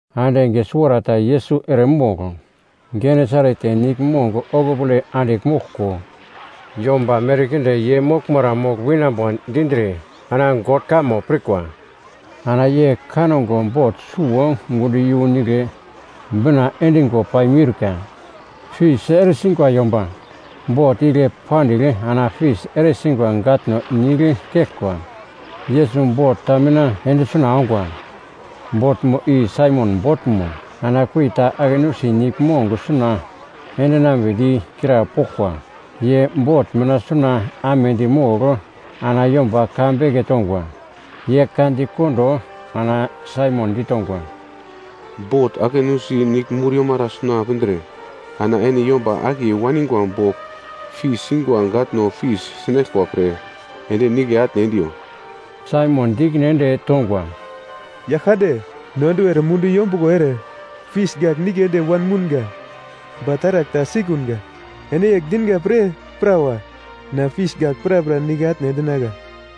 Ande enge suwarata Yesus eremogl Genesaret niglmong okupole andigl moglko, yomba merkinde ye moglmara mogl winambo dindre ana God kamo pirkwa. Ana ye kango bot suwo gundo iyu nigle bina endingo paimiurka. Fis eresingwa yomba bot igle pandigl ana fis eresingwa gatno nigl keglkwa. Yesus bot ta mina ende suna ongwa, botmo i Saimon botmo. Ana kurita ake nusi niglmong suna endinambedi krapoglkwa. Ye bot mina suna amedi mogl ana yomba ka beke tongwa. Ye ka dikondo ana Saimon ditongwa, “Bot ake nusi i niglmur yomara suna pindre ana ene yomba akiye waningwa bogl fis singwa gatno fis sinaglkwa pre ende nigle atne endiyo.” Saimon di ikine ende tongwa, “Yaglkande, no enduwer mundu yombuglo ere fis gagl nigle ende wanmounga. Ba taragl ta sikunga. Ene yegl dinga pre prawa na fis gagl prapra nigle atne endinagla.”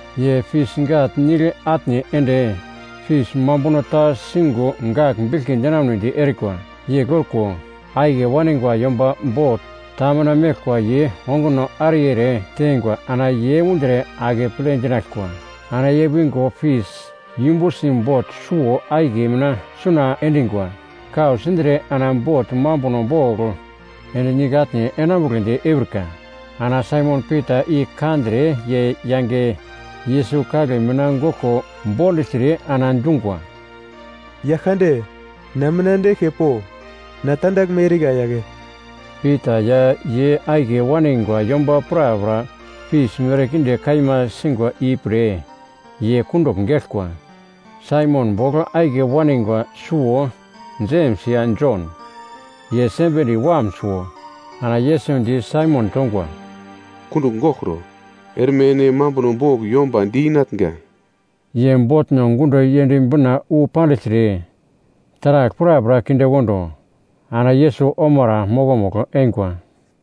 Ye fis gagl nigl atne ende, fis mambuno ta singo gagl biglki dinamunedi erikwa. Yegl orko, akiye waningwa yomba bot ta mina meglkwa ye onguno ariye ere teingwa ana ye undre akeple dinaglkwa. Ana ye wingo fis yumbusi bot suwo-akiye mina suna endingwa kau sindre ana bot mambuno bogl ende nigle atne enambugledi eurika. Ana Saimon Pita i kandre ye yange Yesus kagle mina goglko bondugltre ana dungwa, “Yaglkande na mina ende eglke po, na tandaglme erika yagle!” Pita ya ye akiye waningwa yomba prapra fis merkinde kaima singwa i pre ye kundugl geglkwa. Saimon bogl akiye waningwa suwo Jems ya Jon, ye Sebedi wam suwo. Ana Yesus di Saimon tongwa, “Kundugl goglkro. Erme ene mambuno bogl yomba di-inatnga.” Ye botno gundo yend bina wu pandigltre, taragl prapra kinde kondo, ana Yesus omara mokomugl eingwa.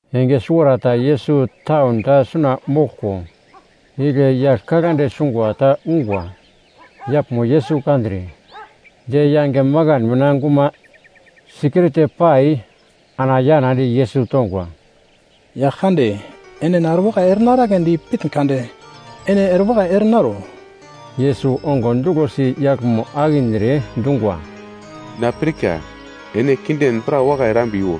Enge suwarata Yesus taun ta suna moglko, igle yagl kaglande sungwa ta ungwa. Yaglmo Yesus kandre, ye yange makan mina guma sikirte pai ana yanadi Yesus tongwa, “Yaglkande, ene na erewakai ere naraglendi pitn kade, ene erewakai ere naro.” Yesus ongo duglosi yaglmo akindre dungwa, “Na pirka, ene kinden pra wakai erambiwo.”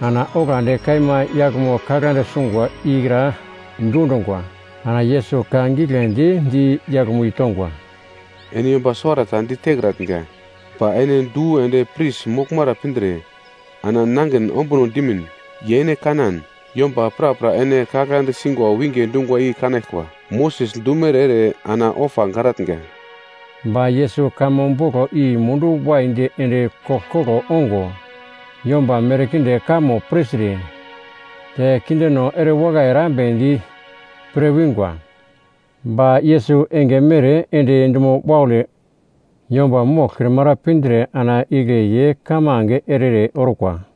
Ana oglandi kaima yaglmo kaglande sungwa ikra dundungwa. Ana Yesus ka giglendi di yaglmo i tongwa, “Ene yomba suwarata ditekratnga, ba ene du ende pris moglmara pindre ana nangin ombuno dimin. Ye ene kanan, yomba prapra ene kaglande singa winge dungwa i kanaglkwa, Moses dumere ere ana ofa garatnga.” Ba Yesus kamo boglo i mundu waidi ende koglkoglo ongo, yomba merkinde kamo pirtre, te kindeno erewakai erambedi pre wingwa. Ba Yesus enge mere ende dumo waule yomba moglkrimara pindre ana igle ye kamange ere-ere orkwa.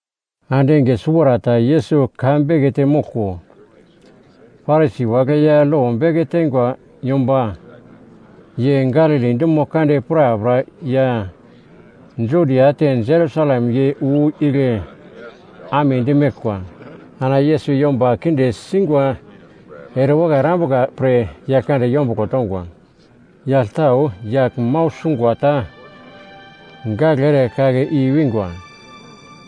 Ande enge suwarata Yesus ka bekete moglko, Parisi wagle ya lo beke teingwa yomba ye Galili dumo kande prapra ya Judia te Jerusalem ye wu igle amedi meglkwa. Ana Yesus yomba kinde sungwa erewakai erambuka pre Yaglkande yombuglo tongwa. Yagl tau yagl mau sungwa ta gagle ere kake i wingwa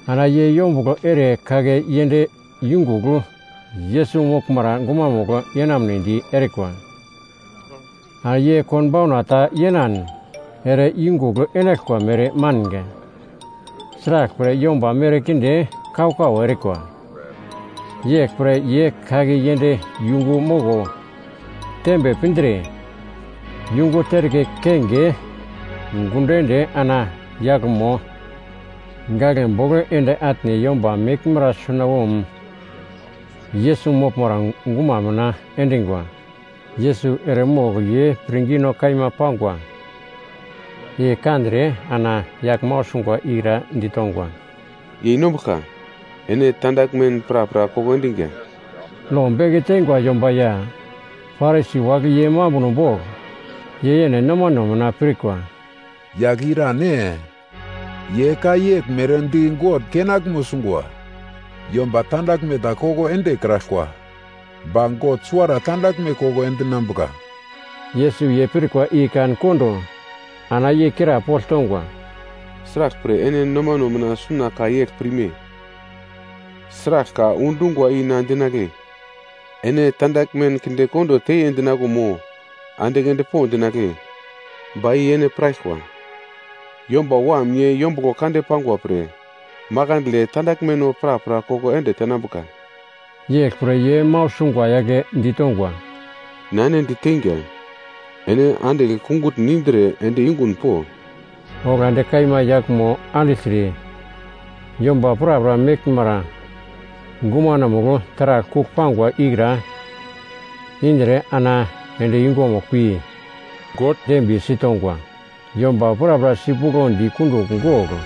ana ye yombuglo ere kake yend yungugl Yesus moglmara gumamugl yenamnedi erikwa. Ana ye konbauna ta yenan ere i yungugl enaglkwa mere manga. Sraglpre, yomba merkinde kau-kau erikwa. Yeglpre ye kake yend yungu moko tembe pindre, yungu terke kenge gundo ende ana yaglmo gaglebogl ende atne yomba meglmara sunawom Yesus moglmara guma mina endingwa. Yesus eremogl ye pirngino kaima pangwa i kandre ana yagl mau sungwa ikra ditongwa. “Yeinombuglka, ene tandaglmen prapra koko endiga.” Lo beke teingwa yomba ya Parisi wagle ye mambuno bogl ye yene nomane mina pirkwa, “Yagl i irane? Ye ka yegl mere di God kenaglmo sungwa. Yomba tandaglme ta koko endekraglkwa, ba God suwara tandaglme koko endinambuka.” Yesus ye pirkwa i kan kondo ana ye krapogl tongwa, “Sraglpre ene nomano mina suna ka yegl pirme? Sragl ka undungwa i na dinagle, ‘Ene tandaglmen kinde kondo teiye’ dinaglo mo ‘Andigl endpo’ dinagle? Ba i ene piraglkwa, Yomba Wam ye yombuglo kande pangwa pre, makandle tandaglmeno prapra koko ende tenambuka.” Yeglpre ye mau sungwa yagle ditongwa, “Na ene diteinga, ene andigl kungutn indre ende yungun po.” Oglandi kaima yaglmo andigltre yomba prapra meglmara gumanomugl taragl kugl pangwa ikra indre ana ende yungumugl pi God dembiye sitongwa. Yomba prapra sipuglodi kundugl gogl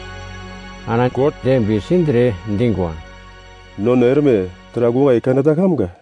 ana God dembiye sindre dingwa, “Nono erme taragl wakai kaneta kamga.”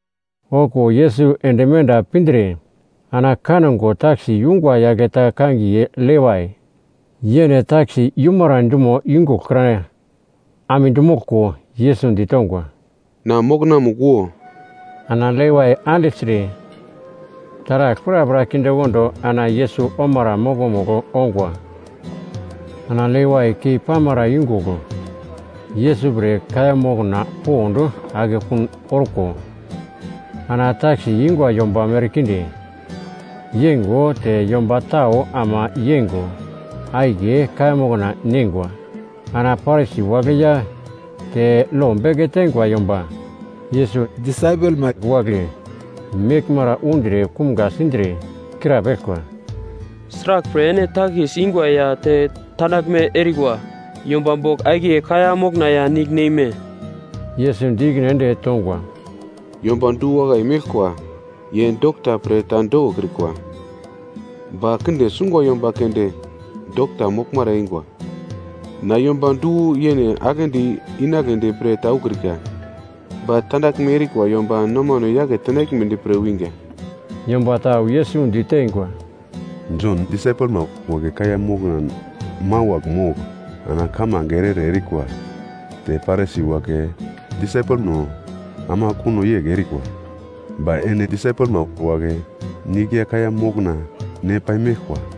Okuwo Yesus ende menda pindre ana kango takis yungwa yagl ta kangiye Levai, yene takis yumara dumo yungugl kra amedi moglko, Yesus ditongwa, “Na mokonamugl wo.” Ana Levai andigltre, taragl prapra kindekondo ana Yesus omara mokomugl ongwa. Ana Levai kei pamara yungugl Yesus pre kaiya mokna pond akekun orko, ana takis ingwa yomba merkinde yeingo te yomba tau ama yeingo akiye kaiya mokna neingwa. Ana Parisi wagle ya te lo beke teingwa yomba Yesus disaipelma wagle meglmara undre kumga sindre, krapeglkwa, “Sraglpre ene takis ingwa ya te tandaglme erikwa yomba bogl akiye kaiya mokna ya nigl neime?” Yesus di ikine ende tongwa, “Yomba du-wakai meglkwa ye dokta pre ta dokokrikwa. Ba kinde sungwa yomba keunde dokta moglmara eingwa. Na yomba du-yene aglendi inagledi pre ta ukrika. Ba tandaglme erikwa yomba nomano yake tenaglmedi pre winga.” Yomba tau Yesus diteingwa, “Jon disaipelma wagle kaiya mokna mawagl mogl ana kamange ere-ere erikwa te Parisi wagle disaipelno ama kuno yegl erikwa. Ba ene disaipelma wagle nigl ya kaiya mokna ne paimeglkwa.”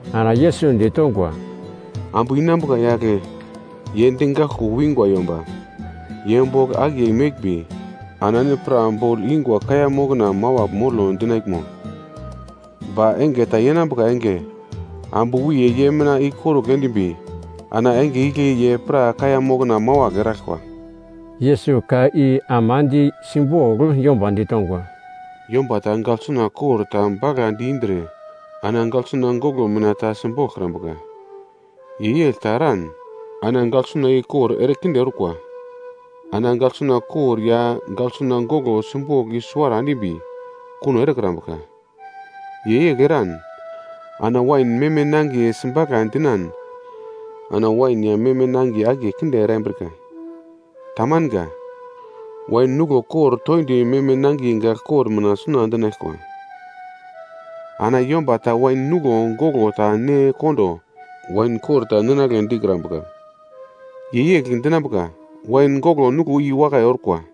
Ana Yesus ditongwa, “Ambu inambuka yagle ye digaglko wingwa yomba, ye bogl akiye meglmbi ana ene pra bogl ingwa kaiya mokna mawagl molo dinaglmo? Ba enge ta yenambuka enge ambu wiye ye mina i korugl endimbi ana enge igle ye pra kaiya mokna mawagl eraglkwa.” Yesus ka i ama di simbogl yomba ditongwa, “Yomba ta gagl suna kor ta bagladi indre ana gaglsuna goglo mina ta simboglkrambuka. Ye yegl ta eran ana gaglsuna i kor ere kinde orkwa. Ana gaglsuna kor ya gaglsuna goglo simbogl i suwarata endimbi kuno erekrambuka. Ye yegl eran ana wain meme nangiye sibagla dinan ana wain ya meme nangiye akiye kinde erambrika. Tamanga! Wain nuglo kor toindi meme nangiye gagl kor mina suna endinaglkwa! Ana yomba ta wain nuglo goglo ta ne kondo, wain kor ta ninagle dikrambuka. Ye yegl dinambuka, ‘Wain goglo nuglo i wakai orkwa.’”